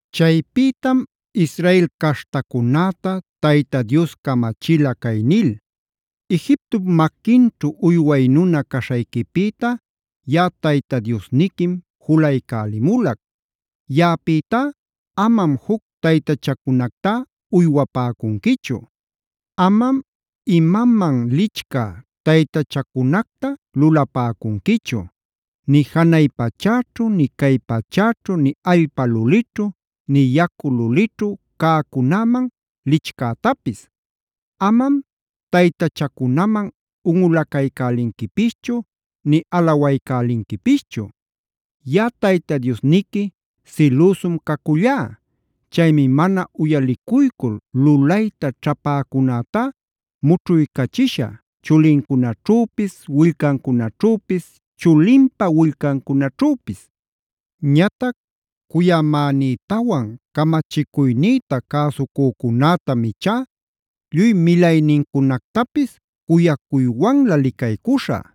Chaypïtam Israel caśhtacunäta Tayta Dios camachila cay nil: “Egiptop maquinćhu uyway nuna caśhayquipïta yaꞌa Tayta Diosniquim julaycälimulac. Yaꞌapïtá amam juc taytachacunactá uywapäcunquichu. “Amam imaman lichcä taytachacunacta lulapäcunquichu; nï janay pachäćhu, nï cay pachäćhu, nï allpa lulićhu, nï yacu lulićhu cäcunäman lichcätapis. Amam taytachacunaman unꞌulaycälinquipischu nï alawaycälinquipischu.a Yaꞌa Tayta Diosniqui silüsum cacullá. Chaymi mana uyalicuycul lulayta ćhapäcunätá mućhuycachishä chulincunaćhüpis, willcancunaćhüpis, chulinpa willcancunaćhüpis. Ñatac cuyamänïtawan camachicuynïta cäsucücunätam ichá lluy milaynincunactapis cuyaywanlä licaycuśhä.b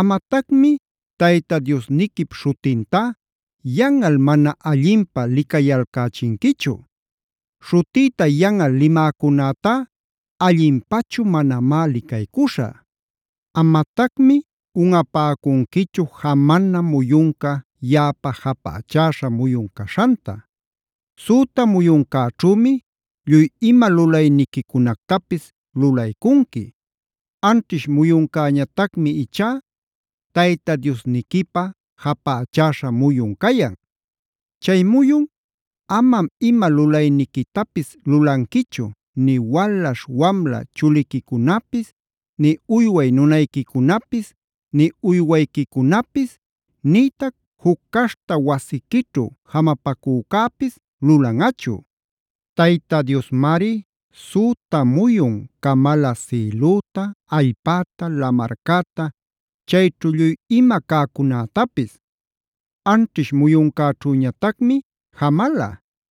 “Amatacmi Tayta Diosniquip śhutintá yanꞌal mana allinpä licayalcächinquichu. Śhutïta yanꞌal limäcunätá allinpachu manamá licaycuśhä. “Amatacmi unꞌapäcunquichu jamana muyunca yaꞌapä japächäśha muyun caśhanta.c Süta muyuncäćhümi lluy ima lulayniquicunactapis lulaycunqui. Anćhish muyuncäñatacmi ichá Tayta Diosniquipä japächäśha muyun cayan. Chay muyun amam ima lulayniquitapis lulanquichu,d nï walaśh wamla chuliquicunapis, nï uyway nunayquicunapis, nï uywayquicunapis, nïtac juc caśhta wasiquićhu jamapacücäpis lulanꞌachu. Tayta Diosmari süta muyun camala sïlüta, allpäta, lamarcäta chayćhu lluy ima cäcunätapis. Anćhish muyuncäćhüñatacmi jamala.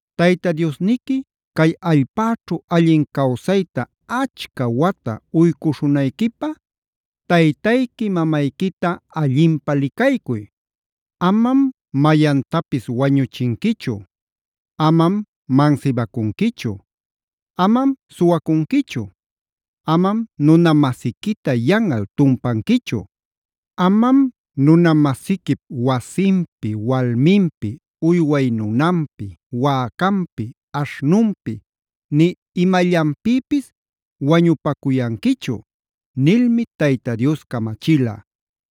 “Tayta Diosniqui cay allpäćhu allin cawsayta achca wata uycuśhunayquipäf taytayqui mamayquita allinpä licaycuy.g “Amam mayantapis wañuchinquichu.h “Amam mansibacunquichu.i “Amam suwacunquichu.j “Amam nuna-masiquita yanꞌal tumpanquichu.k “Amam nuna-masiquip wasinpi, walminpi, uyway nunanpi, wäcanpi, aśhnunpi, nï imallanpïpisl wañupacuyanquichu” nilmi Tayta Dios camachila.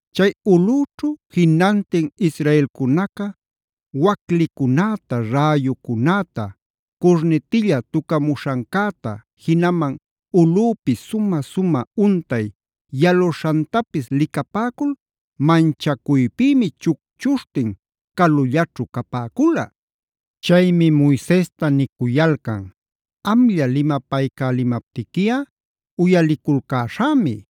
Chay ulꞌüćhu jinantin Israelcunaca waclicunäta, räyucunäta, curnitilla tucamuśhancäta, jinaman ulꞌüpi sumä-sumä untay yaluśhantapis licapäcul manchacuypïmi chucchuśhtin calullaćhu capäcula. Chaymi Moisesta nicuyalcan: “Amlla limapaycälimaptiquiꞌa uyaliculcäśhämi.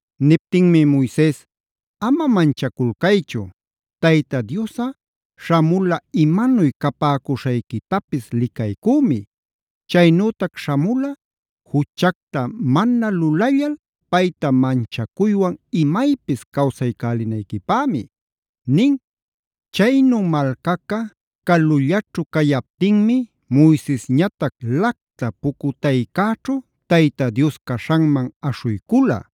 Niptinmi Moises: “Ama manchaculcaychu. Tayta Diosꞌa śhamula imanuy capäcuśhayquitapis licaycümi. Chaynütac śhamula juchacta mana lulallal payta manchacuywan imaypis cawsaycälinayquipämi” nin. Chaynu malcaca calullaćhu cayaptinmi Moisesñatac lacta pucutaycäćhu Tayta Dios caśhanman aśhuycula.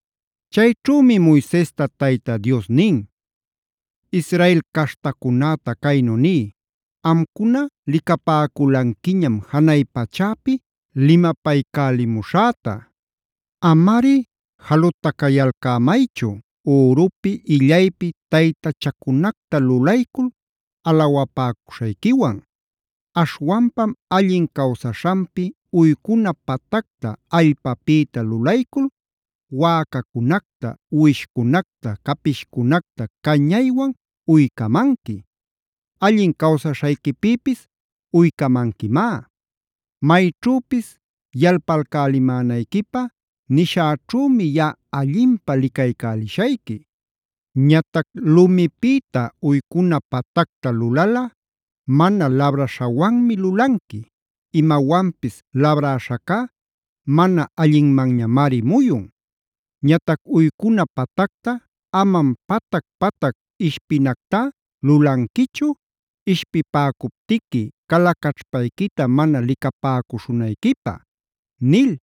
Chayćhümi Moisesta Tayta Dios nin: “Israel caśhtacunäta caynu niy: Amcuna licapäculanquiñam janay pachäpi limapaycälimuśhäta. Amari jalutacayalcämaychu, ürupi illaypi taytachacunacta lulaycul alawapäcuśhayquiwan. Aśhwanpam allin cawsaśhanpi uycuna patacta allpapïta lulaycul wäcacunacta, uwishcunacta, capishcunacta cañaywan uycamanqui; allin cawsaśhayquipïpis uycamanquimá. Mayćhüpis yalpalcälimänayquipä nishäćhümi yaꞌa allinpä licaycälishayqui. Ñatac lumipïta uycuna patacta lulalꞌa mana labraśhawanmi lulanqui.n Imawanpis labräśhacá mana allinmanñamari muyun. Ñatac uycuna patacta amam patac-patac ishpinactá lulanquichu, ishpipäcuptiqui cala caćhpayquita mana licapäcuśhunayquipä” nil.